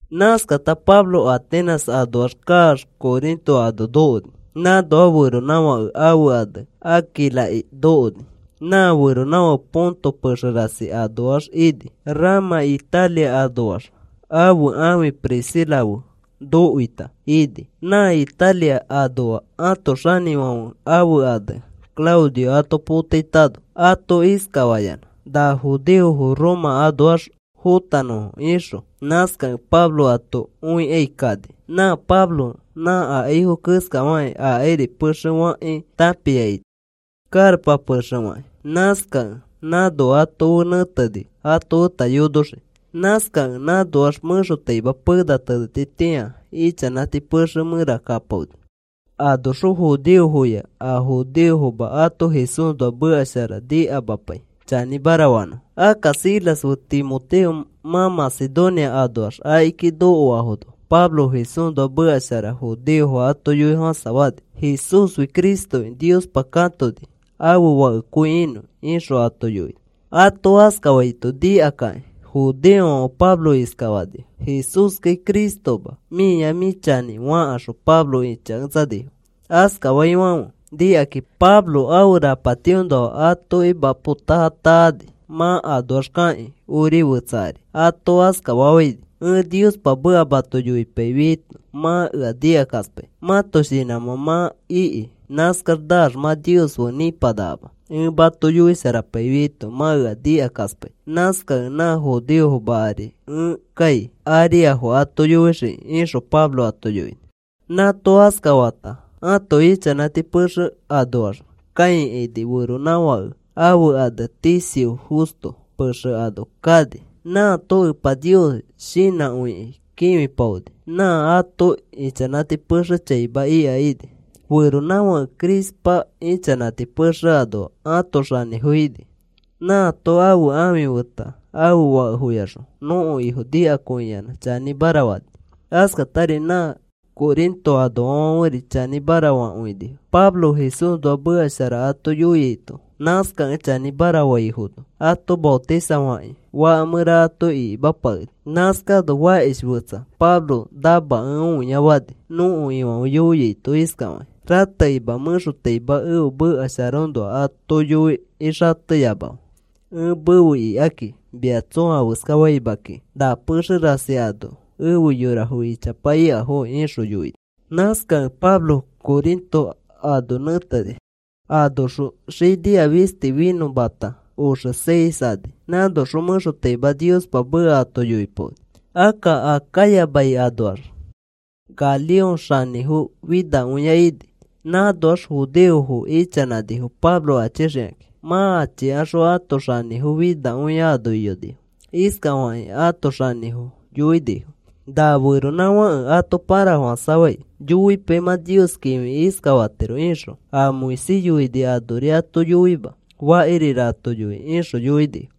Nãskata Pablo Atenas anoax kaax Corinto ano nokoni. Nãnoa feronãfake ãfe ane Aquilaki nokoni. Nã feronãfake Ponto pexe rasi anoa ini. Rama Italia anoax ãfe ãfi Priscila fe nokoita ini, nã Italia anoa ãto xanĩfãfe ãfe ane Claudio ato potaitano. Ato iskafayanã na judeofo Roma anoax fõtanõfo ixõ. Nãskakẽ Pablo ato õikai kani. Nã Pablo nã akaifo keskafakĩ akairi pexe fakãki tãpia ini, karapa pexe fakĩ. Nãskakẽ nãno ato fe nẽteni, ato feta yonoxiki. Nãskakẽ nãnoax mẽxotaima pena tenetitĩa ichanãti pexe mẽra kapaoni. Anoxõ judeofoya a judeofoma ato Jesúsnoa meka shara nikamapai chanĩmara fanõfo. Akka Silas fe Timoteo mã Macedonia anoax akiki nokoafono Pablo Jesúsnoa meka shara judeofo ato yoifofãsafani: “Jesúsfi Cristoki Niospa katoni ãfe Fakekõi inõ,” ixõ ato yoini. Ato askafaito nikakakĩ judeofãfe Pablo iskafanifo: “Jesúskai Cristoma. Mĩa mĩ chanĩ,” fakaxõ Pablo ĩchaketsanifo. Askafaifãfe nikakĩ Pablo ãfe rapatiõnoa atoki mapo taa taani mã anoax kakĩ ori fetsa ari ato iskafafãini: “Ẽ Niospa meka mato yoipaifiaito mã ea nikakaspai. Mãto shinãmã mã iki. Nãskax naax mã Nios fe nĩpanakama. Ẽ mato yoisharapaifiaito mã ea nikakaspai. Nãskakẽ na judeofoma ari ẽ kai ariafo ato yoixiki,” ixõ Pablo ato yoini. Nãato askafata ãto ichanãti pexe anoax kãikaini feronãfake ãfe ane Ticio Justo pexe ano kani. Nãato Epa Nios shinãkõikĩ kĩfipaoni. Nã ato ichanãti pexe chaima ika ini. Feronãfake Crispa ichanãti pexe anoa ãto xanĩfo ini. Nãato ãfe ãfi feta ãfe fakefoyaxõ nõko Ifo nikakõiyanã chanĩmara fani. Askatari nã Corinto anoafãferi chanĩmara fakõinifo, Pablo Jesúsnoa meka shara ato yoiaito. Nãskakẽ chanĩmara faifono ato maotisafakĩ faka mẽra ato ikimapakenifo. Nãskano fakish fetsa Pablo namakẽ õia fani, nõko Ifãfe yoiaito iskafakĩ: “Ratekima mẽxotaima ẽfe meka sharaõnoa ato yoi xateyamafe. Ẽ mefe ikaki mia tsõa afeska faima kiki. Na pexe rasi ano efe yorafo ichapa ikafokĩ,” ixõ yoini. Nãskakẽ Pablo Corinto ano nẽteni. Anoxõ xinia fisti finõmata oxe seis ani. Nãnoxõ mẽxotaima Niospa meka ato yoipaoni. Akka Acaya mai anoax Galión xanĩfo finakõia ini. Nãnoax judeofo ichanãnifo Pablo achixikãki. Mã achikaxõ ãto xanĩfo finakõia ano iyonifo. Iskafakĩ ãto xanĩfo yoinifo: “Na feronãfãke ato pãrafofãsafai, yoipai mã Nios kĩfiki iskafatiro ixõ. A Moisés yoini anori ato yoima, fakirira ato yoi,” ixõ yoinifo.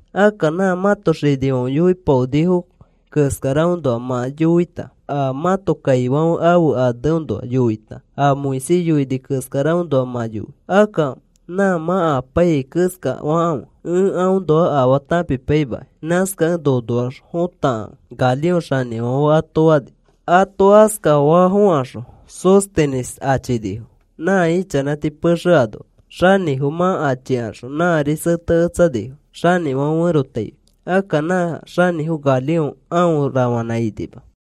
Akka nã mãto xinifãfe yoipaonifo keskaraõnoa mã yoita, a mãto kaifãfe ãfe aneõnoa yoita, a Moisés yoini keskaraõnoa mã yoi. Akka nã mã apaiyai keskafakãfe, ẽ aõnoa afaa tãpipaimakai. Nãskakẽ nonoax fotakãfe,” Galión xanĩfãfe ato fani. Ato askafa fokaxõ Sóstenes achinifo nã ichanãti pexe anoa xanĩfo. Mã achikaxõ nãri seteketsanifo xanĩfãfe ferotaifi. Akka nã xanĩfo Galión aõ rafanã inima.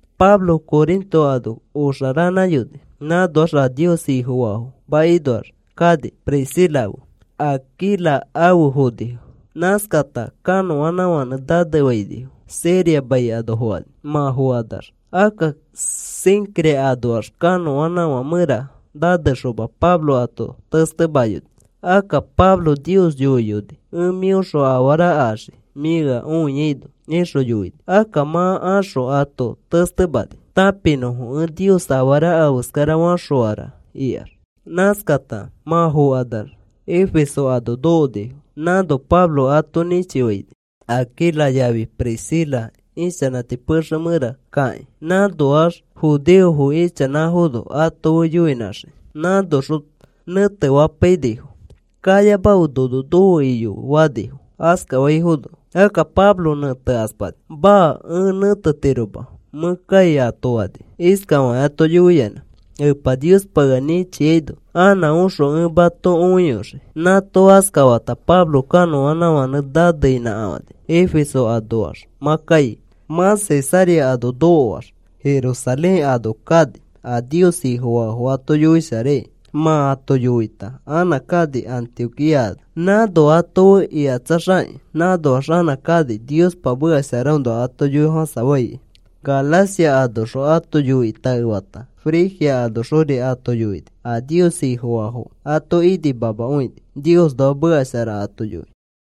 Pablo Corinto ano oxaranãyoni. Nãnoax a Nios Ifofaafo makinoax kani Priscila fe Aquila afe fonifo. Nãskakata kanõnãfãnẽ nanefainifo Siria mai ano fokani. Mã fokanax akka Cencrea anoax kanõanãfã mẽra nanexoma Pablo ato testemayoni. Akka Pablo Nios yoiyoni: “Ẽ mĩõxõ afara axii, mĩ ea õiaino,” ixõ yoini. Akka mã axõ ato testemani tãpinõfo. Ẽ Nios afara afeskarafaxõara ikax. Nãskata mã fokanax Efeso ano nokonifo. Nãno Pablo ato nĩchifaini Aquila yafi Priscila, ichanãti pexe mẽra kakĩ nãanoax judeofo ichanãfono ato fe yoinãxiki. Nãnoxõ nẽtefapainifo. “Kayamafe nono nofe iyofe,” fanifo. Askafaifono akka Pablo nẽtekaspani. “Maa, ẽ nẽtetiroma, mẽ kai,” ato fani iskafakĩ ato yoiyanã: “Epa Niospa ea nĩchiaino anã oxõ ẽ mato õiyoxii.” Nãato askafata Pablo kanõanãfãnẽ naneinãkafani Efeso anoax mã kai. Mã Cesarea ano nokoax, Jerusalén ano kani a Nios Ifofaafo ato yoisharaikai. Mã ato yoita anã kani Antioquía ano. Nãno ato fe ikatsaxakĩ, nãnoax anã kani Niospa meka sharaõnoa ato yoifofãsafaikai. Galacia anoxõ ato yoikĩ taefata, Frigia anoxori ato yoini. A Nios Ifofaafo ato inimamakõini, Niosnoa meka shara ato yoikĩ.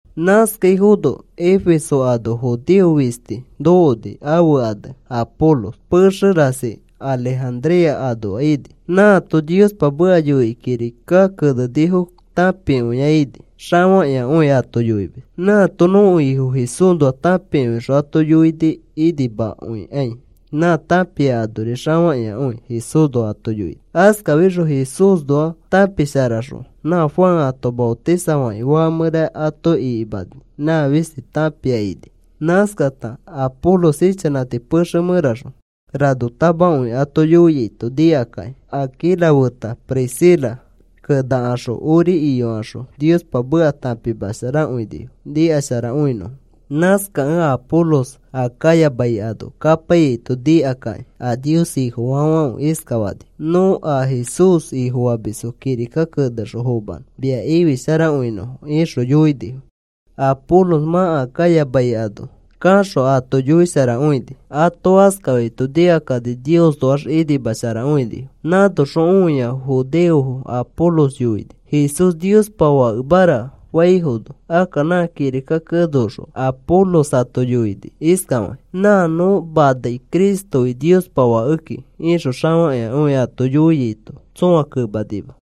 Nãskaifono Efeso ano judeo fisti nokoni ãfe ane Apolos pexe rasi Alejandría anoa ini. Nãato Niospa meka yoikĩ kirika kenenifo tãpikõia ini, xafakĩakõi ato yoimis. Nãato nõko Ifo Jesúsnoa tãpikõixõ ato yoini, inimakõikai nã tãpia anori xafakĩakõi Jesúsnoa ato yoini. Askafixõ Jesúsnoa tãpisharaxõ nã Juan ato maotisafakĩ faka mẽra ato ikimani nã fisti tãpia ini. Nãskata Apolos ichanãti pexe mẽraxõ ranotamakõi ato yoiaito nikakĩ. Aquila feta Priscila kenakaxõ ori iyokaxõ Niospa meka tãpimasharakõinifo nikasharakõinõ. Nãskakẽ Apolos Acaya mai ano kapaiyaito nikakĩ a Nios Ifofaafãfe iskafanifo: “Nõ a Jesús Ifofamisfo kirika kenexõ fomanõ mia ifisharakõinõfo,” ixõ yoinifo. Apolos mã Acaya mai ano kaxõ, ato yoisharakõini. Ato askafaito nikakani Niosnoax inimasharakõinifo. Nãnoxõ õiaifo judeofo Apolos yoini: “Jesús Niospa Fakemara,” faifono. Akka nã kirika keneaõxõ Apolos ato yoini iskafakĩ: “Nã nõ manai Cristofi Niospa Fakeki,” ixõ xafakĩakõi ato yoiaito tsõa kemanima.